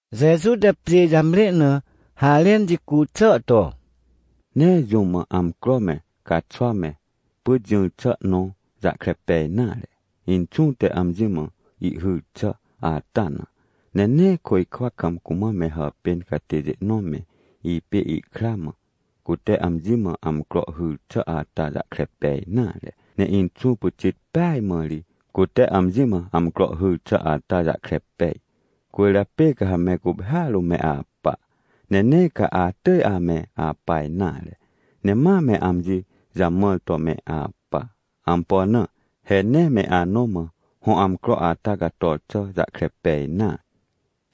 Jeju te pjê jamre na harẽn jicu xà to: — Nee jũm mã amcro me, caxwa me, pyt jỹr xà nõ jahkre pej nare, Inxũ te amji mã ihhyr xà ata na. Ne nee côjkwa kam cumã me hàpên catêjê nõ me, ipê ikra mã, cute amji mã amcro hyr xà ata jahkre pej nare. Ne Inxũ pyxit peaj mãri cute amji mã amcro hyr xà ata jahkre pej. Cwỳrjapê ca ha me guphêa rũm me apa, ne nee ca atỳj ame apa nare, ne ma me amji jamãr to me apa. Ampo na? He nee me anõ mã hõ amcro ata cator xà jahkre pej nare.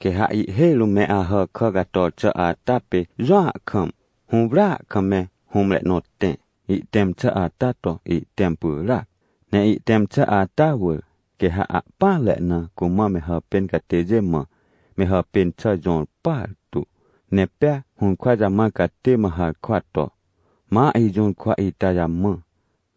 — Quê ha ihhêj rũm me Ahàkà cator xà ata pê jũa kam, hũwrya kam me hũmre nõ tẽ, ihtẽm xà ata to ihtẽm pyràac. Ne ihtẽm xà ata wỳr, quê ha ahpỹanre na cumã me hàpên catêjê mã, me hàpên xà jõr partu. Ne pea hũrkwa jamãr catê mã harkwa to: “Ma ijũrkwa ita jamã,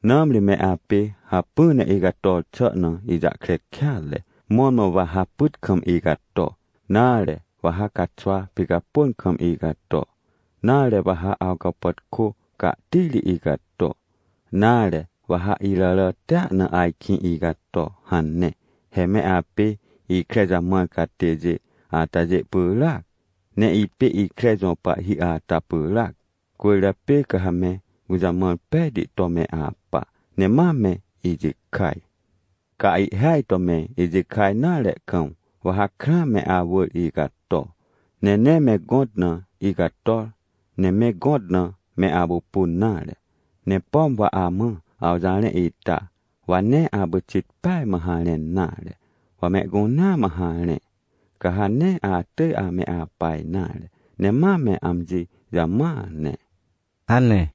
nãmri me apê hacpỹ ne icator xà na ijahkre kêatre, mõrmõ wa ha pyt kam icato, nare, wa ha caxwa picapôn kam icato, nare wa ha awcapàtkô cahtiri icato, nare, wa ha iràràtia na ajkĩ icato” hane. — He me apê ikre jamãr catêjê atajê pyràac, ne ipê ikre jõ pahhi ata pyràac. Cwỳrjapê ca ha me gũjamãr pejti to me apa, ne ma me ijikaj. Ca ihhêaj to me ijikaj nare kam, wa ha krãa me awỳr icato, ne nee me gõt na icator, ne me gõt na me apupun nare! Ne pom wa amã awjarẽ ita, wa nee apyxit peaj mã harẽn nare, wa mehcunea mã harẽ, ca ha nee atỳj ame apa nare, ne ma me amji jamãa ne! — hane.